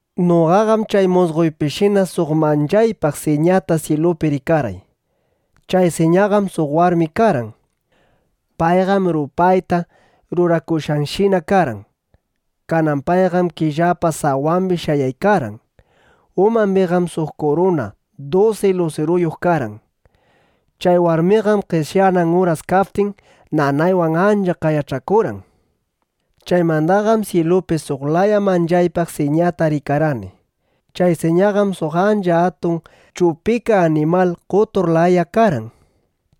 Noqaqam chay musqoypishina suq manchaypaq siñata syilupi rikarqay. Chay siñaqam suq warmi karqan. Payqam rupayta rurakushqashina karqan. Kanan payqam killapa sawambi shayaykarqan. Umambiqam suq kuruna dusi lusiruyuq karqan. Chay warmiqam qeshyanan uras kaptin, nanaywan ancha qayach'akurqan. Chaymandaqam syilupi suq laya manchaypaq siñata rikarqani. Chay siñaqam suq ancha atun chupika animal qotur laya karqan.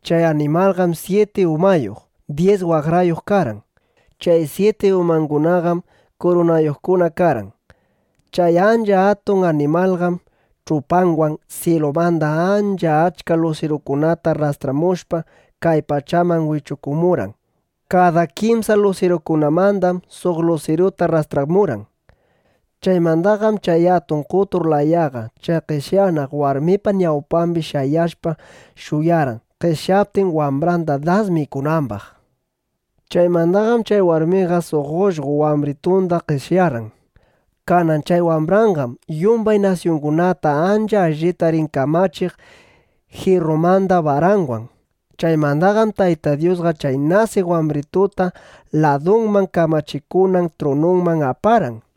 Chay animalqam syiti umayuq, dyis waqrayuq karqan. Chay syiti umangunaqam kurunayuqkuna karqan. Chay ancha atun animalqam ch'upanwan syilumanda ancha achka lusirukunata rrastramushpa, kay pachaman wichukumurqan. Kada kimsa lusirukunamandam suq lusiruta rrastramurqan. Chaymandaqam chay atun qotur layaqa chay qeshyanaq warmipa ñawpambi shayashpa shuyarqan, qeshyaptin wambranda das mikunambaq. Chaymandaqam chay warmiqa suq ullqo wambritunda qeshyarqan. Kanan chay wambranqam yumbay nasyungunata ancha allita rin kamachiq jirrumanda baranwan. Chaymandaqam Tayta Dyusqa chay nasiq wambrituta ladunman kamachikunan trununman aparqan.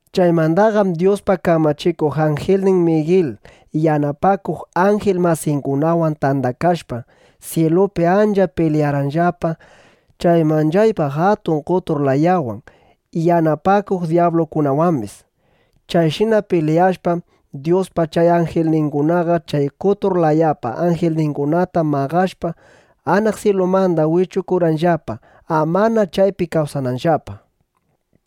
Chaymandaqam Dyuspa kamachikuq anjilnin Migil yanapakuq anjil masingunawan tandakashpa, syilupi ancha pilyarqanllapa chay manchaypaq atun qotur layawan, yanapakuq dyablungunawambis. Chayshina pilyashpam, Dyuspa chay anjilningunaqa chay qotur layapa anjilningunata maqashpa, anaq syilumanda wichukurqanllapa, amana chaypi kawsananllapa.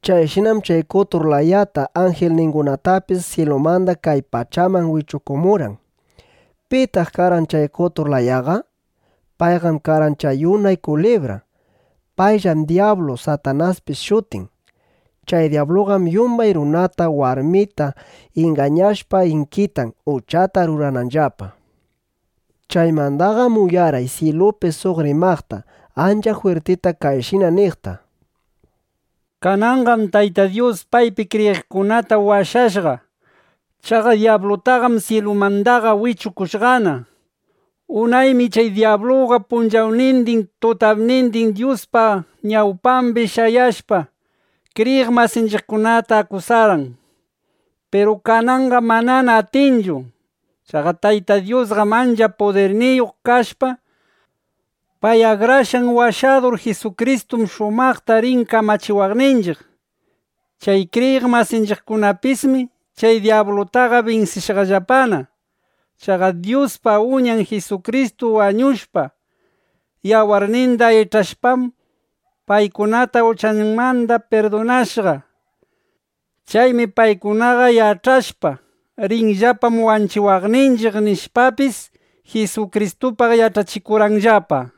Chayshinam chay qotur layata, anjilningunatapis syilumanda kay pachaman wichukumurqan. ¿Pitaq karqan chay qotur layaqa? Payqam karqan chay unay kulibra. Payllam dyablu, Satanaspis shutin. Chay dyabluqam yumbay runata, warmita ingañashpa inkitan, uchata rurananllapa. Chaymandaqam uyarqay syilupi suq rimaqta, ancha jwirtita kayshina niqta: —Kananqam Tayta Dyus paypi kriyiqkunata washashqa. Chaqa dyablutaqam syilumandaqa wichukushqana. Unaymi chay dyabluqa punchawnindin, tutapnindin Dyuspa ñawpambi shayashpa, kriyiq masinchiqkunata akusarqan. Piru kananqam manana atinchu. Chaqa Tayta Dyusqam ancha pudirniyuq kashpa, pay Akrashqan Washadur Jisukristuwan shumaqta rin kamachiwaqninchiq. Chay kriyiq masinchiqkunapismi chay dyablutaqa binsishqallapana. Chaqa Dyuspa Uñan Jisukristu wañushpa, yawarninda ich'ashpam, paykunata uchangunamanda pirdunashqa. Chaymi paykunaqa yach'ashpa: Rinllapam wanchiwaqninchiq, nishpapis, Jisukristupaq yach'achikurqanllapa.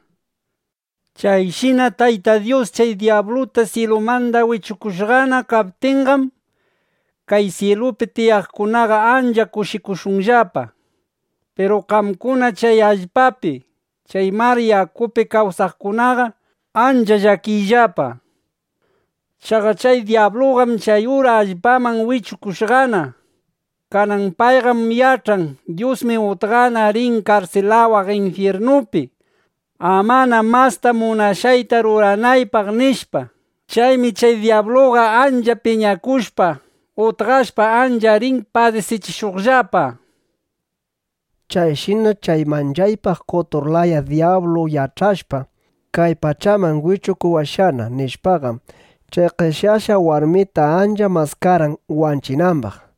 Chayshina Tayta Dyus chay dyabluta syilumanda wichukushqana kaptinqam, kay syilupi tiyaqkunaqa ancha kushikushunllapa. Piru qamkuna chay allpapi, chay mar yakupi kawsaqkunaqa ancha llakiyllapa. Chaqa chay dyabluqam chay ura allpaman wichukushqana. Kanan payqam yach'an: Dyusmi utqana rin karsilawaq infyirnupi, amana masta munashqayta ruranaypaq, nishpa. Chaymi chay dyabluqa ancha piñakushpa, utqashpa, ancha rin padisichishuqllapa. Chayshina chay manchaypaq qotur laya dyablu yach'ashpa: Kay pachaman wichukuwashqana, nishpaqam, chay qeshyashqa warmita ancha maskarqan wanchinambaq.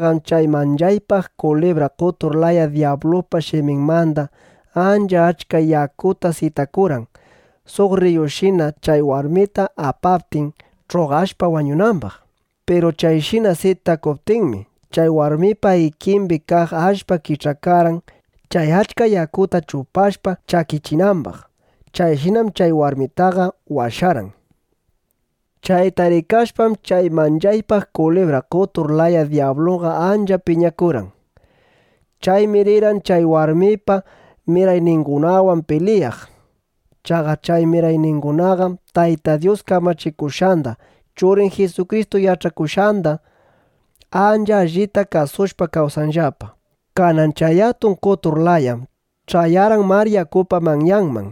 Kanan chayta rikashpam, chay manchaypaq kulibra qotur laya dyabluqa shiminmanda ancha achka yakuta sitakurqan, suq rriyushina chay warmita apaptin, ch'uqashpa wañunambaq. Piru chayshina sitakuptinmi, chay warmipa ikimbi kaq allpa kich'akarqan chay achka yakuta chupashpa chakichinambaq. Chayshinam chay warmitaqa washarqan. Chayta rikashpaqam, chay manchaypaq kulibra qotur laya dyabluqa ancha piñakurqan. Chaymi rirqan chay warmipa mirayningunawan pilyaq. Chaqa chay mirayningunaqam Tayta Dyus kamachikushqanda, Churin Jisukristu yach'achikushqanda ancha allita kasushpa kawsanllapa. ˻ Kanan chay atun qotur layam ch'ayarqan mar yakupa manyambi. ˼